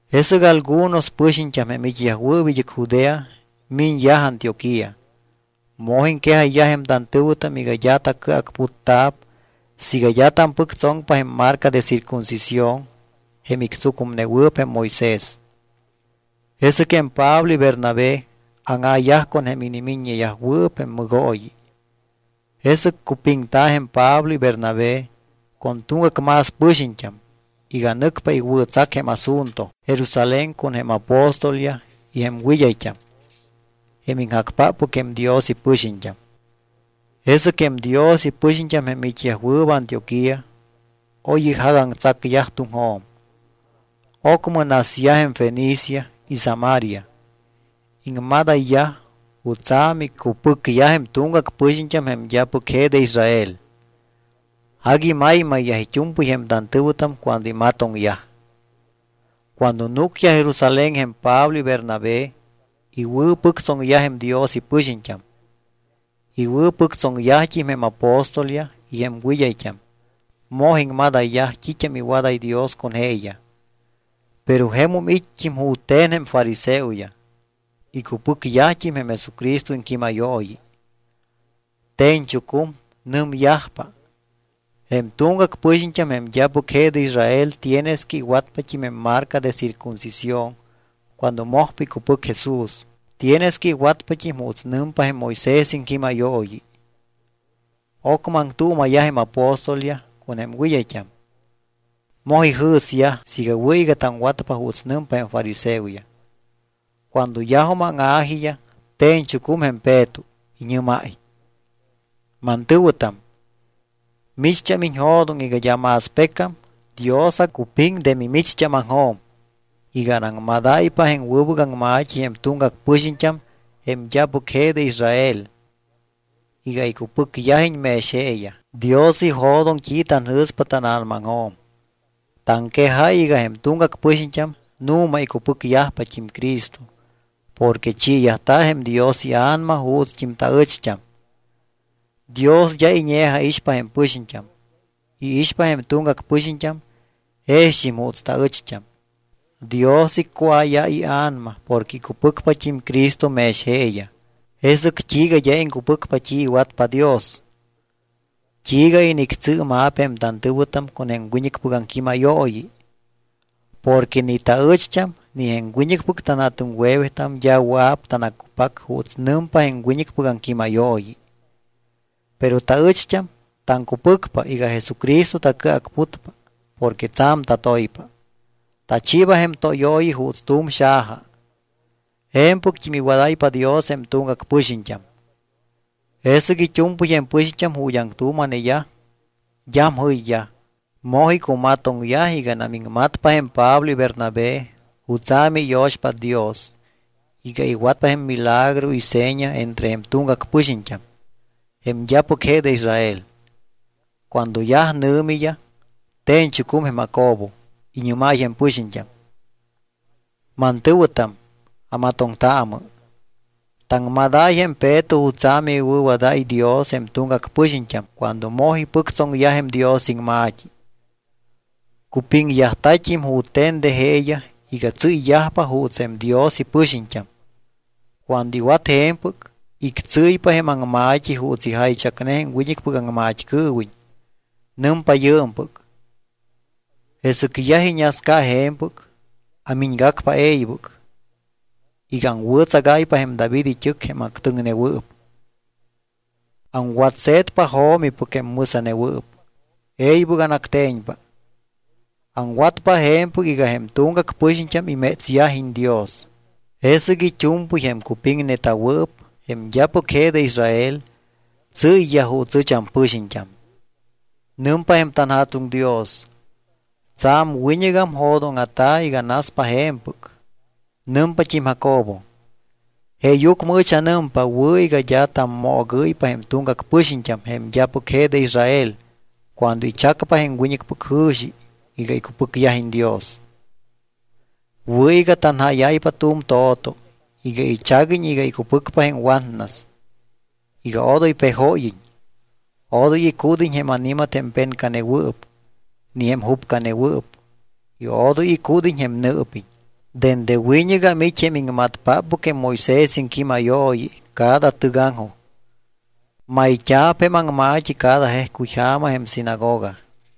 Jesɨc algunos pɨxiñt́am, jém it́yajwɨɨp id́ɨc Judea, miñyaj Antioquía. Moj iŋquejayyaj jém tantɨ̱wɨtam iga d́a tacɨacputta̱p siiga d́a tampɨctsoŋpa jém marca de circuncisión jém ictsucumnewɨɨp jém Moisés. Jesɨc jém Pablo y Bernabé áŋa̱yaj con jém inimiññeyajwɨɨp jém mɨgooyi. Jesɨc cupiŋta̱ jém Pablo y Bernabé con tuŋgac más pɨxiñt́am iga nɨcpa iwɨ̱tsac jém asunto Jerusalén con jém apóstolyaj y jém wɨd́ayt́am, jém iŋjacpáppɨc jém Dios ipɨxiñt́am. Jesɨc jém Dios ipɨxiñt́am jém it́yajwɨɨp Antioquía oy ijagaŋtsacyaj tuŋjo̱m. Ocmɨ nasyaj jém Fenicia y Samaria. Iŋmadayyaj jutsa̱ micupɨcyaj jém tuŋgac pɨxiñt́am jém d́apɨc je de Israel. Agui maymayyaj it́u̱mpɨy jém tantɨ̱wɨtam cuando imatoŋyaj. Cuando núcyaj Jerusalén jém Pablo y Bernabé, iwɨ̱pɨctsoŋyaj jém Dios ipɨxiñt́am. Iwɨ̱pɨctsoŋyajt́im jém apóstolyaj y jém wɨd́ayt́am. Moj iŋmadayyaj t́it́am iwadáy Dios con jeeyaj. Pero jemum it́t́im jute̱n jém fariseoyaj, icupɨcyajt́im jém Jesucristo iŋquímayooyi. Te̱ñchucum, nɨmyajpa: —Jém tuŋgac pɨxiñt́am jém d́apɨc je de Israel tienes que iwatpat́im jém marca de circuncisión cuando mojpa icupɨc Jesús. Tienes que iwatpat́im juuts nɨmpa jém Moisés iŋquímayooyi. Ocmɨ aŋtuuma̱yaj jém apóstolyaj con jém wɨd́ayt́am. Moj ijɨ̱syaj siiga wɨ̱ iga taŋwatpa juuts nɨmpa jém fariseoyaj. Cuando yajum áŋa̱jiyaj, te̱ñchucum jém Peto. Iñɨ́máy: —Mantɨ̱wɨtam, micht́am iñjo̱doŋ iga d́a más pecam Dios acupiŋ de mimicht́ámaŋjo̱m iga anaŋmadáypa jém wɨbɨc aŋma̱t́i jém tuŋgac pɨxiñt́am jém d́apɨc je de Israel iga icupɨcyajiñ mex jeeyaj. Dios ijo̱doŋ t́i tanjɨ̱spa tána̱namaŋjo̱m. Taŋquejáy iga jém tuŋgac pɨxiñt́am nu̱ma icupɨcyajpat́im Cristo porque chiiyajta̱ jém Dios iA̱nama juutst́im taɨcht́am. Dios d́a iñe̱jaixpa jém pɨxiñt́am. Iixpa jém tuŋgac pɨxiñt́am jext́im juuts taɨcht́am. Dios iccuáyáy ia̱nama porque icupɨcpat́im Cristo mex jeeyaj. Jesɨc t́iiga d́a iŋcupɨcpa t́i iwatpa Dios. ¿T́iiga inictsɨɨma̱p jém tantɨ̱wɨtam con jém wiñɨcpɨc aŋquímayooyi? Porque ni taɨcht́am ni jém wiñɨcpɨc tanja̱tuŋwe̱wetam d́a wɨa̱p tanaccupac juuts nɨmpa jém wiñɨcpɨc aŋquímayooyi. Pero taɨcht́am taŋcupɨcpa iga Jesucristo tacɨacputpa porque tsa̱m tatoypa. Tachiiba jém tóyooyi juuts tu̱m xaja. Je̱mpɨct́im iwadáypa Dios jém tuŋgac pɨxiñt́am. Jesɨc it́u̱mpɨy jém pɨxiñt́am ju̱t́ aŋtuuma̱neyaj d́am jɨyyaj. Moj icumatoŋyaj iganam iŋmatpa jém Pablo y Bernabé jutsa̱ miyo̱xpát Dios iga iwat jém milagro y seña entre jém tuŋgac pɨxiñt́am, jém d́apɨc je de Israel. Cuando yaj nɨ̱miyaj, te̱ñchucum jém Jacobo, iñɨ́máy jém pɨxiñt́am: —Mantɨ̱wɨtam, amatoŋtaamɨ. Taŋmadáy jém Peto jutsa̱ miwɨ̱wadáy Dios jém tuŋgac pɨxiñt́am cuando moj ipɨctsoŋyaj jém Dios iŋma̱t́i. Cupiŋyajta̱t́im jute̱n de jeeyaj iga tsɨ́yyajpa juuts jém Dios ipɨxiñt́am. Cuando iwat je̱mpɨc, ictsɨ́ypa jém aŋma̱t́i juuts ijaychacne jém wiñɨcpɨc aŋmat́cɨɨwiñ. Nɨmpa yɨɨmpɨc: Jesɨc yaj iñasca je̱mpɨc, amiñgacpa e̱ybɨc iga aŋwɨ̱tsagáypa jém David it́ɨc jém actɨŋnewɨɨp. Aŋwatse̱tpa jo̱mipɨc jém mɨsa̱newɨɨp, e̱ybɨc anacte̱ñpa. Aŋwatpa je̱mpɨc iga jém tuŋgac pɨxiñt́am imétsyajiñ Dios. Jesɨc it́u̱mpɨy jém cupiŋneta̱wɨɨp, jém d́apɨc de Israel, tsɨ́yyaj juuts ɨch ampɨxiñt́am. Nɨmpa jém tanJa̱tuŋ Dios: Tsa̱m wiñɨgam jo̱dóŋa̱ta̱ iga naspa je̱mpɨc. Nɨmpat́im Jacobo: —Jeeyucmɨ ɨch anɨmpa wɨ̱ iga d́a tammoogɨ́ypa jém tuŋgac pɨxiñt́am jém d́apɨc je de Israel cuando ichacpa jém wiñɨcpɨc jɨ̱xi iga icupɨcyajiñ Dios. Wɨ̱ iga tanjáyáypa tu̱m to̱to iga ichaguiñ iga icupɨcpa jém watnas, iga odoy pejóyiñ, odoy icúd́iñ jém ani̱mat jém pencanewɨɨp ni jém jupcanewɨɨp y odoy icúd́iñ jém nɨɨpiñ. Dende wiñɨgam it́ jém iŋmatpáppɨc jém Moisés iŋquímayooyi cada tɨgaŋjoj. Mayt́a̱p jém aŋma̱t́i cada jejcuy ja̱ma jém sinagoga.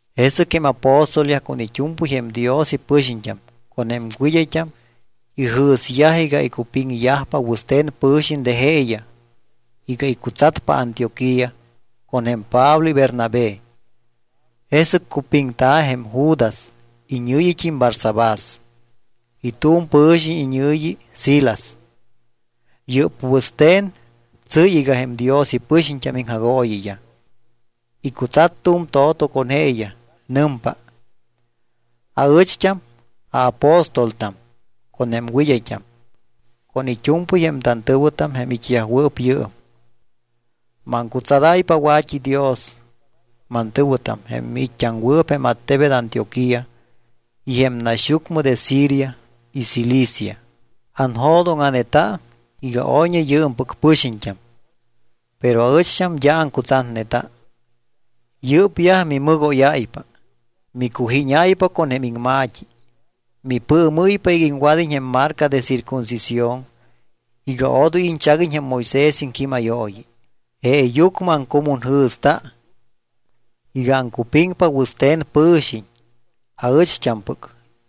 Jesɨc jém apóstolyaj con it́u̱mpɨy de jém Dios ipɨxiñt́am con jém wɨd́ayt́am ijɨ̱syaj iga icupiŋyajpa wɨste̱n pɨ̱xiñ de jeeyaj iga icutsatpa Antioquía con jém Pablo y Bernabé. Jesɨc cupiŋta̱ jém Judas iñɨ̱yit́im Barsabás y tu̱m pɨ̱xiñ iñɨ̱yi Silas. Yɨ́p wɨste̱n tsɨ́y iga jém Dios ipɨxiñt́am iŋjagooyiyaj. Icutsat tu̱m to̱to con jeeyaj. Nɨmpa: “Aɨcht́am aapóstoltam, con jém wɨd́ayt́am, con it́u̱mpɨy jém tantɨ̱wɨtam jém it́yajwɨɨp yɨɨm, maŋcutsadáypa wa̱t́idios, mantɨ̱wɨtam, jém miit́t́aŋwɨɨp jém attebet Antioquía y jém naxyucmɨ de Siria y Cilicia. Anjo̱doŋa̱neta iga oyñe yɨɨmpɨc pɨxiñt́am, pero aɨcht́am d́a aŋcutsatneta. Yɨ́pyaj mimɨgóyáypa, micujíñáypa con jém iŋma̱t́i. Mipɨɨmɨ́ypa iga iŋwad́iñ jém marca de circuncisión y iga odoy iñchaguiñ jém Moisés iŋquímayooyi. Jeeyucmɨ aŋcumunjɨ̱sta iga aŋcupiŋpa wɨste̱n pɨ̱xiñ aɨcht́ampɨc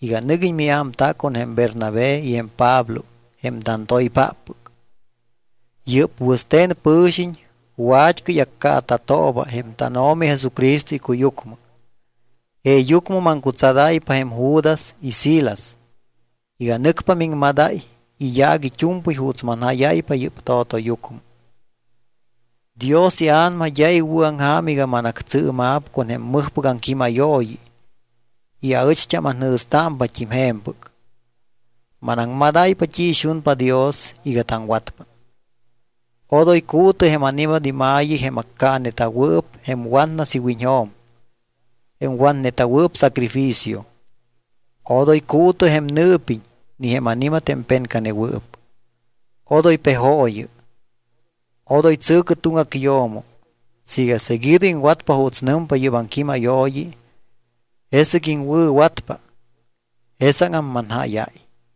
iga nɨguiñ miámta con jém Bernabé y jém Pablo jém tantoypáppɨc. Yɨ́p wɨste̱n pɨ̱xiñ wat́cɨy accaata̱tooba jém tánO̱mi Jesucristo icuyucmɨ. Jeeyucmɨ maŋcutsadáypa jém Judas y Silas iga nɨcpa miŋmadáy iyaac it́u̱mpɨy juuts manjáyáypa yɨ́p to̱toyucmɨ. Dios iA̱nama d́a iwɨ̱aŋja̱m iga manactsɨɨma̱p con jém mɨjpɨc aŋquímayooyi y aɨcht́am anjɨ̱stámpat́im je̱mpɨc. Manaŋmadáypa t́i ixunpa Dios iga taŋwatpa: Odoy cuutɨ jém ani̱mat ima̱yi, jém accaaneta̱wɨɨp jém watnas iwiñjo̱m, jém watneta̱wɨɨp sacrificio. Odoy cuutɨ jém nɨɨpiñ ni jém ani̱mat jém pencanewɨɨp. Odoy pejooyɨ. Odoy tsɨ̱cɨ tuŋgac yo̱mo. Siiga seguido iŋwatpa juuts nɨmpa yɨ́p aŋquímayooyi, jesɨc iŋwɨ̱watpa. Jesáŋam manjáyáy.”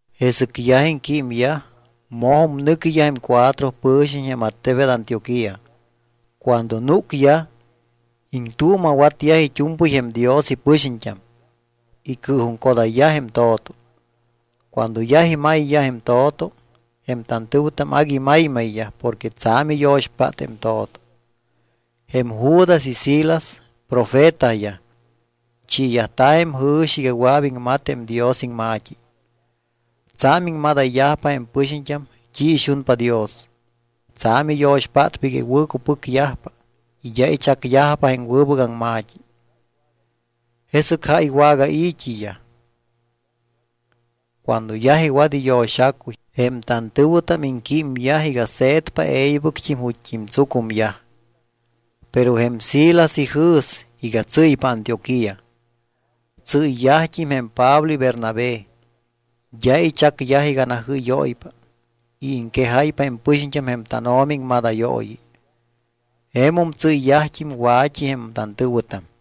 Jesɨc yaj iŋquímyaj, mojum nɨquiyaj jém cuatro pɨxiñt́am jém attebet Antioquía. Cuando núcyaj, iŋtuuma̱watyaj it́u̱mpɨy jém Dios ipɨxiñt́am. Icɨɨjuŋcodayyaj jém to̱to. Cuando yaj imayyaj jém to̱to, jém tantɨ̱wɨtam agui maymayyaj porque tsa̱m iyo̱xpát jém to̱to. Jém Judas y Silas profetayaj, chiiyajta̱ jém jɨ̱xi iga wɨa̱p iŋmat jém Dios iŋma̱t́i. Tsa̱m iŋmadayyajpa jém pɨxiñt́am t́i ixunpa Dios. Tsa̱m iyo̱xpátpa iga iwɨ̱cupɨcyajpa y d́a ichacyajpa jém wɨbɨc aŋma̱t́i. Jesɨc jáy wagai̱t́iyaj. Cuando yaj iwat iyo̱xacuy, jém tantɨ̱wɨtam iŋquímyaj iga se̱tpa e̱ybɨc ju̱t́t́im tsucumyaj. Pero jém Silas ijɨ̱s iga tsɨ́ypa Antioquía. Tsɨ́yyajt́im jém Pablo y Bernabé. D́a ichacyaj iga najɨ́yóypa y iŋquejáypa jém pɨxiñt́am jém tánO̱mi iŋmadayooyi. Jemum tsɨ́yyajt́im wa̱t́i jém tantɨ̱wɨtam.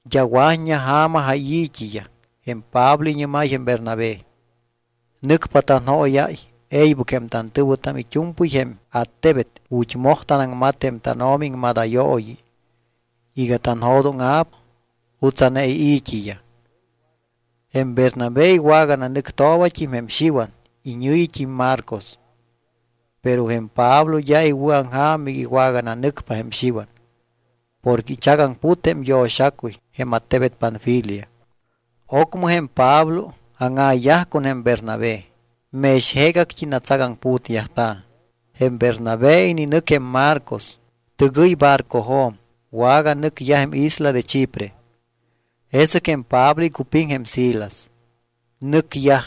D́a wa̱t́ña ja̱ma jáyi̱t́iyaj, jém Pablo iñɨ́máy jém Bernabé: —Nɨcpa tanjóyáy e̱ybɨc jém tantɨ̱wɨtam it́u̱mpɨy jém attebet ju̱t́ moj tanaŋmat jém tánO̱mi iŋmadayooyi iga tanjo̱dóŋa̱p jutsa̱ne ii̱t́iyaj. Jém Bernabé iwagananɨctoobat́im jém Xiwan iñɨ̱yit́im Marcos. Pero jém Pablo d́a iwɨ̱aŋja̱m iga iwagananɨcpa jém Xiwan porque ichagaŋput jém yo̱xacuy jém attebet Panfilia. Ocmɨ jém Pablo áŋa̱yaj con jém Bernabé. Mex jeegact́i natsagaŋputyajta̱. Jém Bernabé ininɨc jém Marcos. Tɨgɨy barcojo̱m, waganɨcyaj jém isla de Chipre. Jesɨc jém Pablo icupiŋ jém Silas. Nɨcyaj.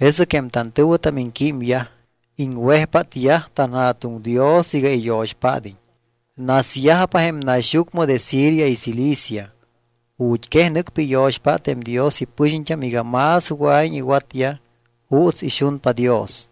Jesɨc jém tantɨ̱wɨtam iŋquímyaj, iŋwejpátyaj tanJa̱tuŋ Dios iga iyo̱xpád́iñ. Nasyajpa jém naxyucmɨ de Siria y Cilicia. Ju̱t́ quej nɨcpa iyo̱xpát jém Dios ipɨxiñt́am iga más wɨa̱iñ iwatyaj juuts ixunpa Dios.